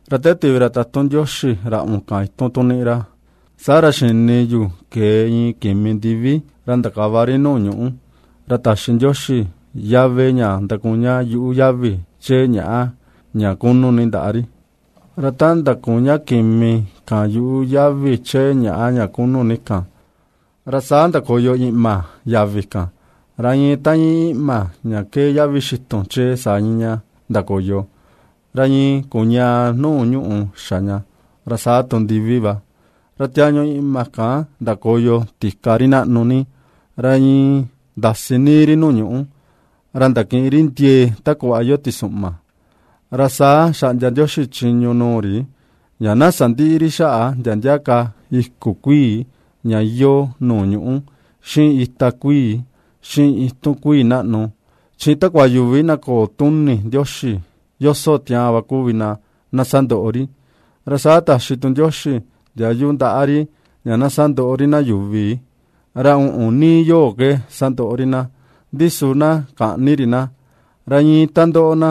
Ra te tivi ra tatun Ndioxi ra uꞌun kan itun tu nii ra, saa ra xini yu kee iin kimi ndivi ra ndakava ri nuu ñuꞌu, ra taxi Ndioxi yave ña ndakuña yuꞌu yavi chee ñàꞌa ña kunu ni ndaꞌa ri. Ra ta ndakuña kimi kan yuꞌu yavi chee ñàꞌa ña kunu ni kan, ra saa ndakoyo iꞌma yavi kan, ra iin ta íin iꞌma ña ^kee yavi xitun chee, saa íin ña ndakoyo, ra iin kuñaa nuu ñuꞌù xa ña, ra saa tu ndivi va. Ra tiañu iꞌma kan ndakoyo tika ri naꞌnu ni, ra iin ndasi níí ri nuu ñuꞌú, ra ndakiꞌin ri ndiee ta kuꞌva iyoo tisuꞌma. Ra saa xaꞌndia Ndioxi chiñu nuu ri ña na sandïꞌi ri xaꞌa ndia ndia iku kuii ña iyoo nuu ñuꞌú, xiꞌin itia kuii, xiꞌin itun kuii naꞌnu, chi takua yuvi na köo tuni Ndioxi yoso tiaan va kuvi na na sandoꞌo ri. Ra saa taxi tu Ndioxi ndiayu ndaꞌa ri ña na sandoꞌo ri na yuvi, ra uꞌun níí yoo ke sandoꞌo ri na; ndi su na käꞌni ri na. Ra iin ta ndoꞌo na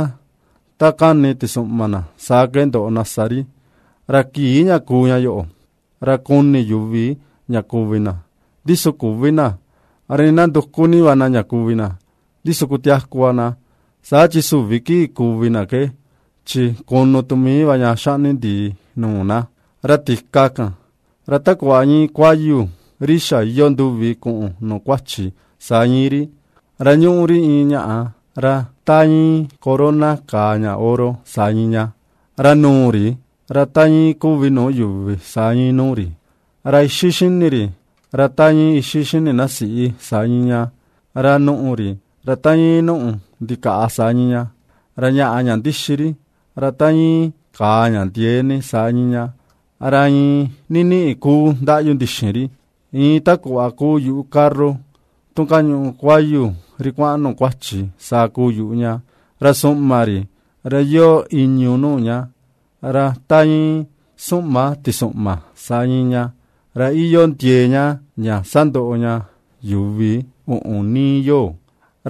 ta kani tisuꞌma na saa ke ndoꞌo na sa ri. Ra kii ña kuu ña yoꞌo, ra kuni yuvi ña kuvi na, ndi su küvi na; ra nii na nduku ni va na ña kuvi na, ndi su kutiaku va na. Saa chi süvi kii kuvi na ke chi kunu tu mii va ña xaꞌni ndii nuu na. Ra tika kan, ra ta kuꞌva íin kuayu, ri xa̱ iyoo nduvi kuꞌun nuu kuachi, saa íin ri; ra ñuꞌu ri iin ñaꞌa ra ta íin corona kàà ña oro, saa íin ña. Ra nuu ri, ra ta íin kuvi nuu yuvi, saa íin nuu ri. Ra ixi xini ri, ra ta íin ixi xini na siꞌi, saa íin ña; ra nùꞌù ri, ra ta íin nùꞌù ndikaꞌa saa íin ña. Ra ñaꞌa ña ndixi ri, ra ta íin kàà ña ndiee ni, saa íin ña; ra iin niniꞌi kuu ndaꞌyu ndixin ri, iin takuu yuꞌu carro tu kañuꞌu kuayu ri kuaꞌan nuu kuachi, saa kuu yuꞌu ña. Ra suꞌma ri, ra iyoo ìñu̱ nuu ña, ra ta íin suꞌma tisuꞌma, saa íin ña; ra iyoo ndiee ña ña sandoꞌo ña yuvi uꞌun níí yoo.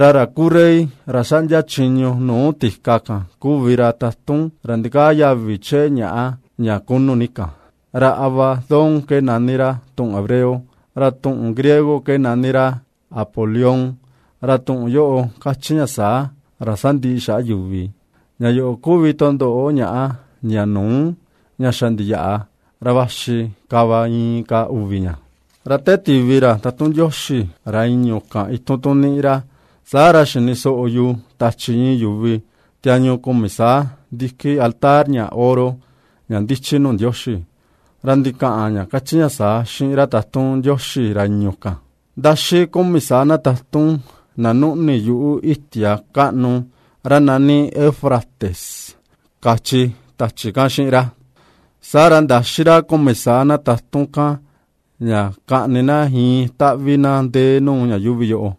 Ra ra kuu rey ra ^xaꞌndia chiñu nuu tika kan kuvi ra tatun ra ndikaa yavi chee ñaꞌa ña kunu ni kan. Ra Abadón ke nani ra tuꞌun hebreo, ra tuꞌun griego ke nani ra Apoleón. Ra tuꞌun yoꞌo kachi ña saa, Ra sandiꞌi xaꞌa yuvi. Ña yoꞌo kuvi tundoꞌo ñàꞌa, ña nuu, ña xa ndiyaꞌa, ra vaxi ka va inka uvi ña. Ra te tivi ra tatun Ndioxi ra i̱ñu̱ kan itun tu niꞌi ra, saa ra xini soꞌo yu tachi iin yuvi tiañu kumi saa ndiki altar, ña oro, ña ndichi nuu Ndioxi. Ra ndikaꞌan ña kachi ña saa xiꞌin ra tatun Ndioxi ra i̱ñu̱ kan: ―Ndaxí kumi saa na tatun, na nuꞌni yuꞌu itia kaꞌnu ra nani Eufrates ―kachi tachi kan xiꞌin ra. Saa ra ndaxi ra kumi saa na tatun kan, ña kaꞌni na iin taꞌvi na ndee nuu ña yuuvi yoo,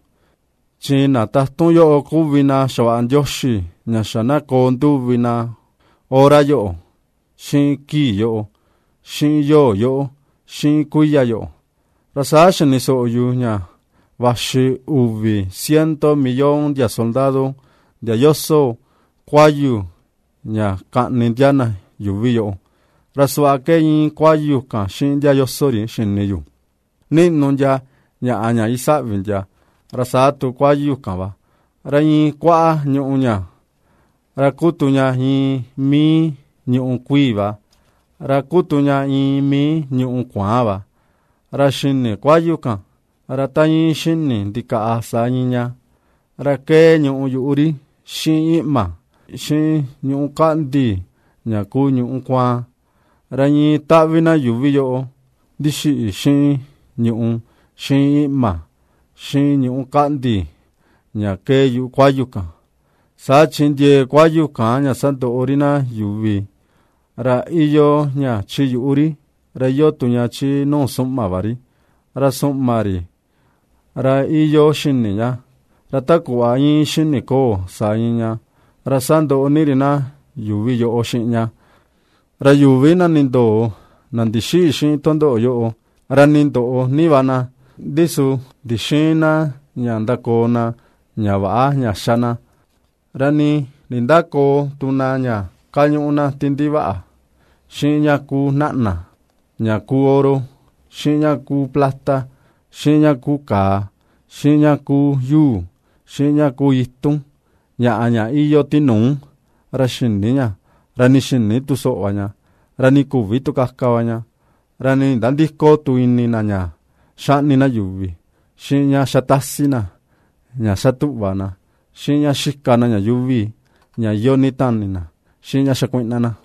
chi na tatun yoꞌo kuvi na xavaꞌa Ndioxi ña xa na koo nduvi na hora yoꞌo, xiꞌin kii yoꞌo, xiꞌin yoo yoꞌo, xiꞌin kuiya yoꞌo. Ra saa xini soꞌo yu ña vaxi uvi ciento millón ndia soldado, ndia yoso kuayu ña kaꞌni ndia na yuvi yoꞌo. Ra suꞌva ke iin kuayu kan xiꞌin ndia yoso ri xini yu: ^niꞌnu ndia ñaꞌa ña isaꞌvi ndia, ra saa tu kuayu kan va, ra iin kuaꞌa ñùꞌù ña, ra kuu tu ña iin mii ñùꞌù kuii va, ra kuu tu ña iin mii ñùꞌù kuaan va. Ra xini kuayu kan, ra ta iin xini ndikaꞌa, saa íin ña; ra kee ñùꞌù yuꞌu ri, xiꞌin iꞌma, xiꞌin ñuꞌú kaꞌndi ña kuu ñuꞌú kuaan. Ra iin taꞌvi na yuvi yoꞌo ndixiꞌi xiꞌin ñùꞌù, xiꞌin iꞌma, xiꞌin ñuꞌú kaꞌndi ña kee yuꞌu kuayu kan. Saa chi ndiee kuayu kan, ña sandoꞌo ri yuvi, ra iyoo ña chi yuꞌu ri, ra iyoo tu ña chi nu suꞌma va ri; ra suꞌma ri, ra iyoo xini ña, ra ta kuꞌva íin xini koo, saa íin ña, ra sandoꞌo ni ri na yuuvi yoꞌo xiꞌin ña. Ra yuvi na nindoo, na ndixïꞌi xiꞌin tundoꞌo yoꞌo, ra nii ndoꞌo ni va na, ndi su ndixïin na ña ndakoo na ña väꞌa ña ^xa na, ra nii nindäkoo tu na ña kañuꞌu na ti ndivaꞌa, xiꞌin ña kuu naꞌna, ña kuu oro, xiꞌin ña kuu plata, xiꞌin ña kuu kàà, xiꞌin ña kuu yuu, xiꞌin ña kuu itun, ñaꞌa ña iyoo tinuu ra xïni ña, ra nii xïni tu soꞌo va ña, ra nii küvi tu kaka va ña. Ra nii nindandïko tu ini na ña ^xaꞌni na yuvi, xiꞌin ña ^xa tasi na, ña xa tuꞌva na, xiꞌin ña ^xika na ña yuuvi ña iyoo ni tani na, xiꞌin ña xakuiꞌna na.